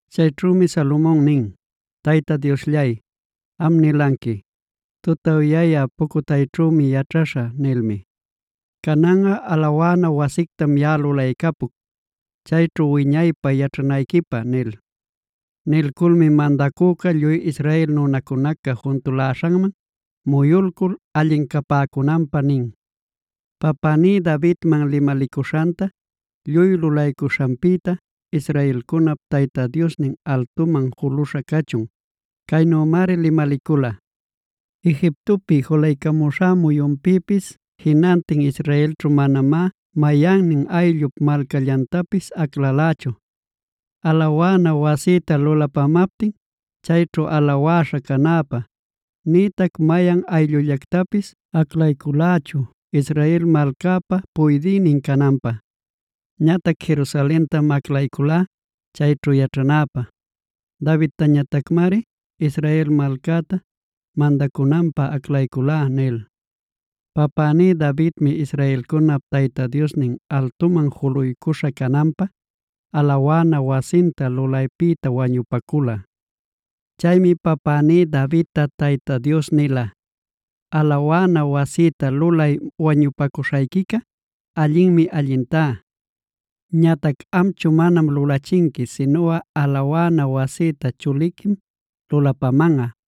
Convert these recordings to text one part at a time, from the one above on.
Chayćhümi Salomon nin: “Tayta Diosllay, am nilanqui: ‘tutawyayä pucutayćhümi yaćhaśhä’ nilmi. Cananꞌa alawana wasictam yaꞌa lulaycapuc, chayćhu wiñaypä yaćhanayquipä” nil. Nilculmi mandacüca lluy Israel nunacunaca juntuläśhanman muyulcul allin capäcunanpä nin: “Papäní Davidman limalicuśhanta lluy lulaycuśhanpïta, israelcunap Tayta Diosnin altuman juluśha cachun. Caynümari limalicula: ‘Egiptopi julaycamuśhá muyunpïpis jinantin Israelćhu manamá mayannin ayllup malcallantapis aclalächu, alawana wasïta lulapamaptin chayćhu alawäśha canäpä; nïtac mayan ayllullactapis aclayculächu Israel malcäpa puydïnin cananpä. Ñatac Jerusalentam aclayculá chayćhu yaćhanäpä. Davidtañatacmari Israel malcäta mandacunanpä aclayculá’ nil. “Papäní Davidmi israelcunap Tayta Diosnin altuman juluycuśha cananpä, alawana wasinta lulaypïta wañupacula. Chaymi papäní Davidta Tayta Dios nila: ‘Alawana wasïta lulay wañupacuśhayquica allinmi allintá. Ñatac amchu manam lulachinqui, sinuꞌa alawana wasïta chuliquim lulapamanꞌa,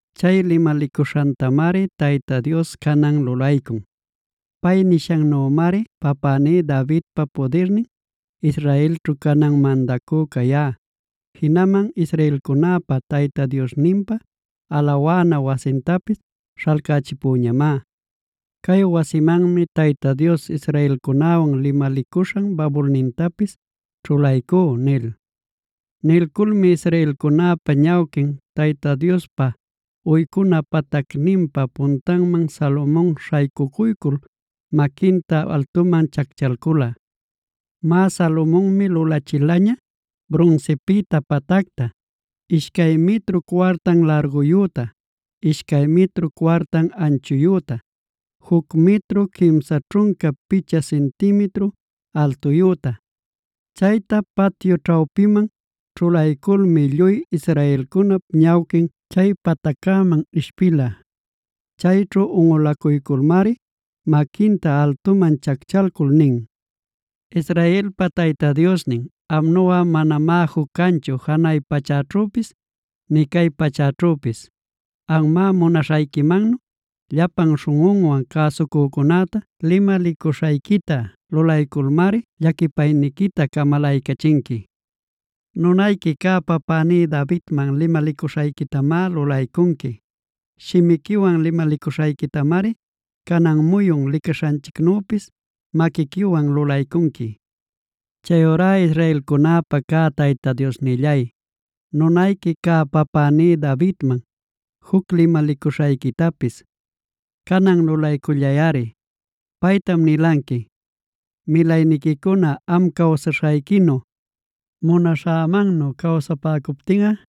“Chay limalicuśhantamari Tayta Dios canan lulaycun. Pay nishannümari papäní Davidpa pudirnin, Israelćhu canan mandacü cayá. Jinaman israelcunäpa Tayta Diosninpa alawana wasintapis śhalcächipüñamá. Cay wasimanmi Tayta Dios israelcunäwan limalicuśhan babulnintapis ćhulaycú” nil. Nilculmi israelcunäpa ñawquin, Tayta Diospa uycuna patacninpa puntanman, Salomon śhaycucuycul maquinta altuman chacchalcula. Má, Salomonmi lulachilaña brunsipïta patacta, ishcay mitru cuartan larguyüta, ishcay mitru cuartan anchuyüta, juc mitru quimsa ćhunca picha cintimitru altuyüta. Chayta patyu ćhawpiman ćhulayculmi lluy israelcunap ñawquin chay pataccäman ishpila. Chayćhu unꞌulacuyculmari maquinta altuman chacchalcul nin: “Israelpa Tayta Diosnin, amnuꞌa manamá juc canchu janay pachäćhüpis, nï cay pachäćhüpis. Amꞌa, munaśhayquimannu llapan śhunꞌunwan cäsucücunäta limalicuśhayquita lulayculmari llaquipayniquita camalaycachinqui. Nunayqui cä papäní Davidman limalicuśhayquitamá lulaycunqui. Shimiquiwan limalicuśhayquitamari canan muyun licaśhanchicnüpis maquiquiwan lulaycunqui. “Chayurá israelcunäpa cä Tayta Diosnillay, nunayqui cä papäní Davidman juc limalicuśhayquitapis canan lulaycullayꞌari. Paytam nilanqui: ‘Milayniquicuna am cawsaśhayquinu, munaśhämannu cawsapäcuptinꞌa,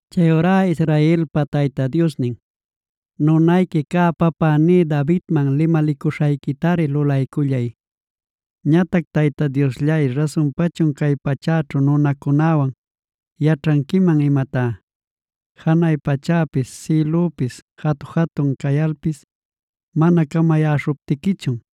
Chayurá Israelpa Tayta Diosnin nunayqui cä papäní Davidman limalicuśhayquitari lulaycullay. “Ñatac ¿Tayta Diosllay rasunpachun cay pachäćhu nunacunäwan yaćhanquiman imatá? Janay pachäpis, sïlüpis jatu-jatun cayalpis mana camayäśhuptiquichun,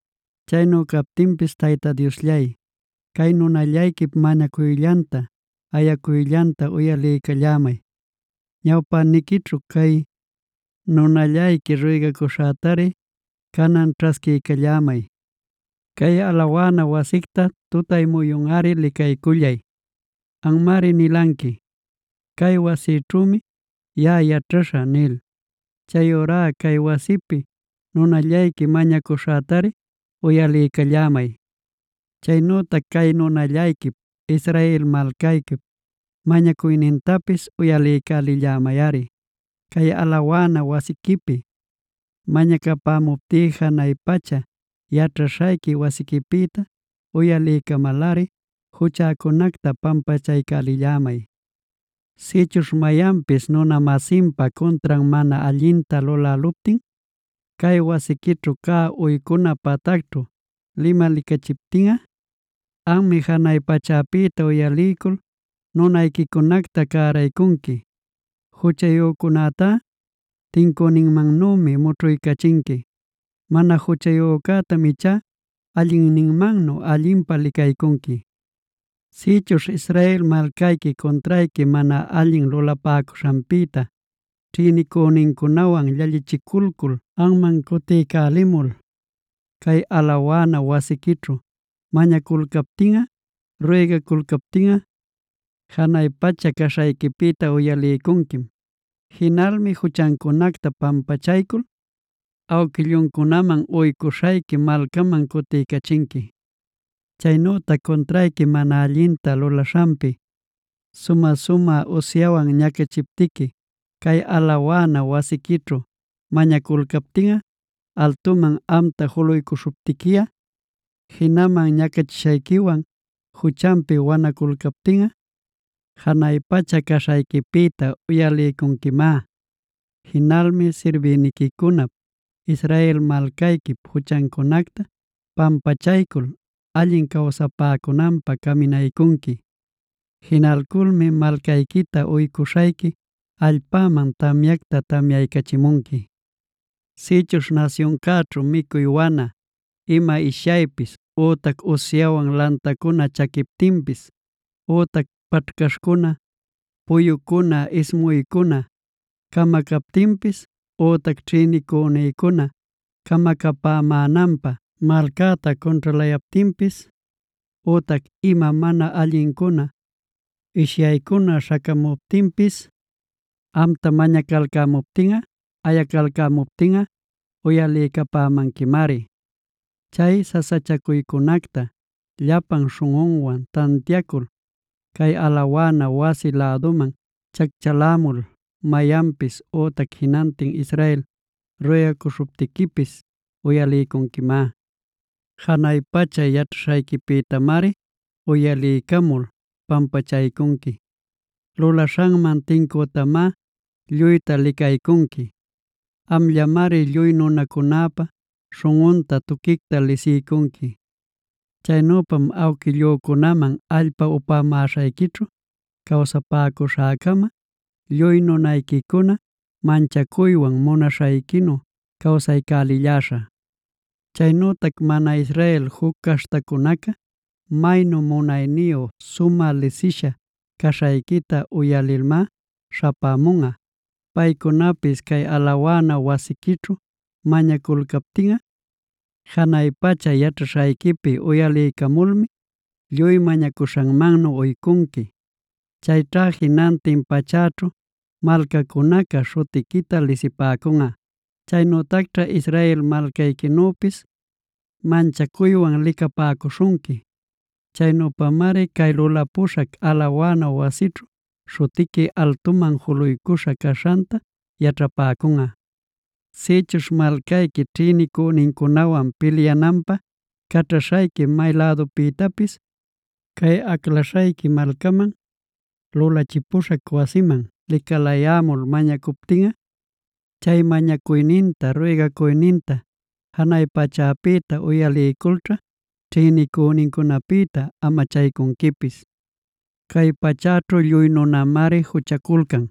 Chaynu captinpis Tayta Diosllay, cay nunallayquip mañacuyllanta, ayacuyllanta uyaliycallämay. Ñawpäniquićhu cay nunallayqui ruygacuśhätari canan ćhasquiycallämay. Cay alawana wasicta tutay muyunꞌari licaycullay. Anmari nilanqui: ‘Cay wasićhümi yaꞌa yaćhaśhä’ nil.d Chayurá cay wasipi nunallayqui mañacuśhätari uyaliycallämay. Chaynütac cay nunallayquip, Israel malcayquip mañacuynintapis uyaliycälillämayꞌari. Cay alawana wasiquipi mañacapämuptí janay pacha yaćhaśhayqui wasiquipïta uyaliycamalꞌari juchäcunacta pampachaycälillämay. “Sïchuśh mayanpis nuna-masinpa cuntran mana allinta luläluptin, cay wasiquićhu cä uycuna patacćhu limalicachiptinꞌa, anmi janay pachäpïta uyaliycul nunayquicunacta cäraycunqui. Juchayücunätá tincüninmannümi mućhuycachinqui. Mana juchayücätam ichá allinninmannu allinpä licaycunqui. “Sïchuśh Israel malcayqui cuntrayqui mana allin lulapäcuśhanpïta, ćhïnicünincunawan llallichiculcul anman cutiycälimul, cay alawana wasiquićhu mañaculcaptinꞌa, ruygaculcaptinꞌa, janay pacha caśhayquipïta uyaliycunquim. Jinalmi juchancunacta pampachaycul awquilluncunaman uycuśhayqui malcaman cutiycachinqui. “Chaynütac cuntrayqui mana allinta lulaśhanpi sumä-sumä usyawan ñacachiptiqui, cay alawana wasiquićhu mañaculcaptinꞌa, altuman amta juluycuśhuptiquiꞌa, jinaman ñacachishayquiwan juchanpi wanaculcaptinꞌa, janay pacha caśhayquipïta uyaliycunquimá. Jinalmi sirbïniquicunap, Israel malcayquip juchancunacta pampachaycul allin cawsapäcunanpä caminaycunqui. Jinalculmi malcayquita uycuśhayqui allpaman tamyacta tamyaycachimunqui. “Sïchuśh nasyuncäćhu micuy wana, ima ishyaypis, ütac usyawan lantacuna chaquiptinpis, ütac paćhcaśhcuna puyucuna ismuycuna camacaptinpis, ütac ćhïnicünïcuna camacapämänanpä malcäta cunćhalayaptinpis, ütac ima mana allincuna, ishyaycuna śhacamuptinpis, amta mañacalcämuptiꞌa, ayacalcämuptiꞌa uyaliycapämanquimari. Chay sasachacuycunacta llapan śhunꞌunwan tantiacul, cay alawana wasi läduman chacchalämul mayanpis ütac jinantin Israel ruygacuśhuptiquipis uyaliycunquimá. Janay pacha yaćhaśhayquipïtamari uyaliycamul pampachaycunqui. Lulaśhanman tincütamá lluyta licaycunqui. Amllamari lluy nunacunäpa śhunꞌunta tuquicta lisiycunqui. Chaynüpam awquillücunaman allpa upämaśhayquićhu cawsapäcuśhäcama, lluy nunayquicuna manchacuywan munaśhayquinu cawsaycälilläśhä. “Chaynütac mana Israel juc caśhtacunaca, maynu munayniyu sumä lisisha caśhayquita uyalilmá śhapämunꞌa. Paycunapis cay alawana wasiquićhu mañaculcaptinꞌa, janay pacha yaćhaśhayquipi uyaliycamulmi, lluy mañacuśhanmannu uycunqui. Chayćha jinantin pachäćhu malcacunaca śhutiquita lisipäcunꞌa. Chaynütacćha Israel malcayquinüpis manchacuywan licapäcuśhunqui. Chaynüpamari cay lulapuśhac alawana wasićhu, śhutiqui altuman juluycuśha caśhanta yaćhapäcunꞌa. “Sïchuśh malcayqui ćhïnicünincunawan pilyananpä caćhaśhayqui may lädupïtapis, cay aclaśhayqui malcaman, lulachipuśhac wasiman licalayämul mañacuptinꞌa, chay mañacuyninta, ruygacuyninta janay pachäpïta uyaliyculćha ćhïnicünincunapïta amachaycunquipis. “Cay pachäćhu lluy nunamari juchaculcan.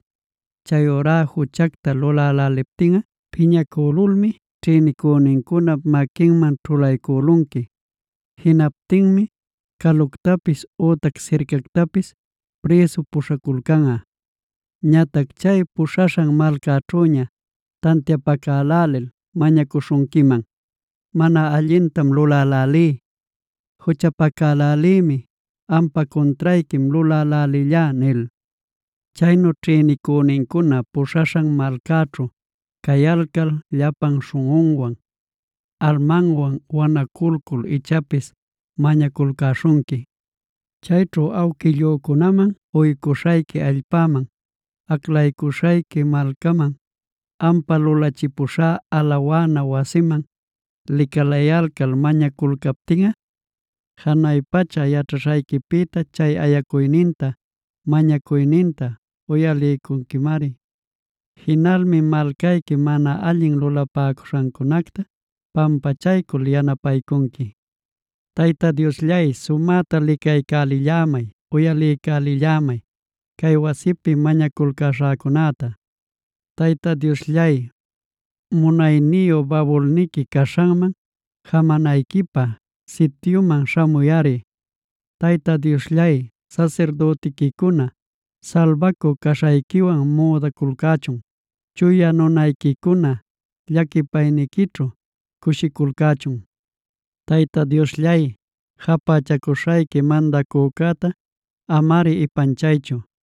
Chayurá juchacta luläläliptinꞌa piñacülulmi ćhïnicünincunap maquinman ćhulaycülunqui. Jinaptinmi caluctapis ütac sircactapis prïsu puśhaculcanꞌa. Ñatac chay puśhaśhan malcaćhüña tantiapacälälil mañacuśhunquiman: ‘Mana allintam lulälälí, juchapacalälïmi, ampa cuntrayquim lulälälillá’ nil. Chaynu ćhïnicünincuna puśhaśhan malcaćhu cayalcal llapan śhunꞌunwan, almanwan wanaculcul ichapis mañaculcäśhunqui. Chayćhu awquillücunaman uycuśhayqui allpaman, aclacuśhayqui malcaman, ampä lulachipuśhá alawana wasiman licalayalcal mañaculcaptinꞌa, janay pacha yaćhaśhayquipïta chay ayacuyninta, mañacuyninta uyaliycunquimari. Jinalmi malcayqui mana allin lulapäcuśhancunacta pampachaycul yanapaycunqui. “Tayta Diosllay, sumäta licaycälillämay, uyaliycälillämay cay wasipi mañaculcäśhäcunäta. “Tayta Diosllay, munayniyu babulniqui caśhanman jamanayquipä sityuman śhamuyꞌari. Tayta Diosllay, sasirdütiquicuna salbacü caśhayquiwan müdaculcächun.e Chuya nunayquicuna llaquipayniquićhu cushiculcächun. Tayta Diosllay, japächacuśhayqui mandacücäta amari ipanchaychu;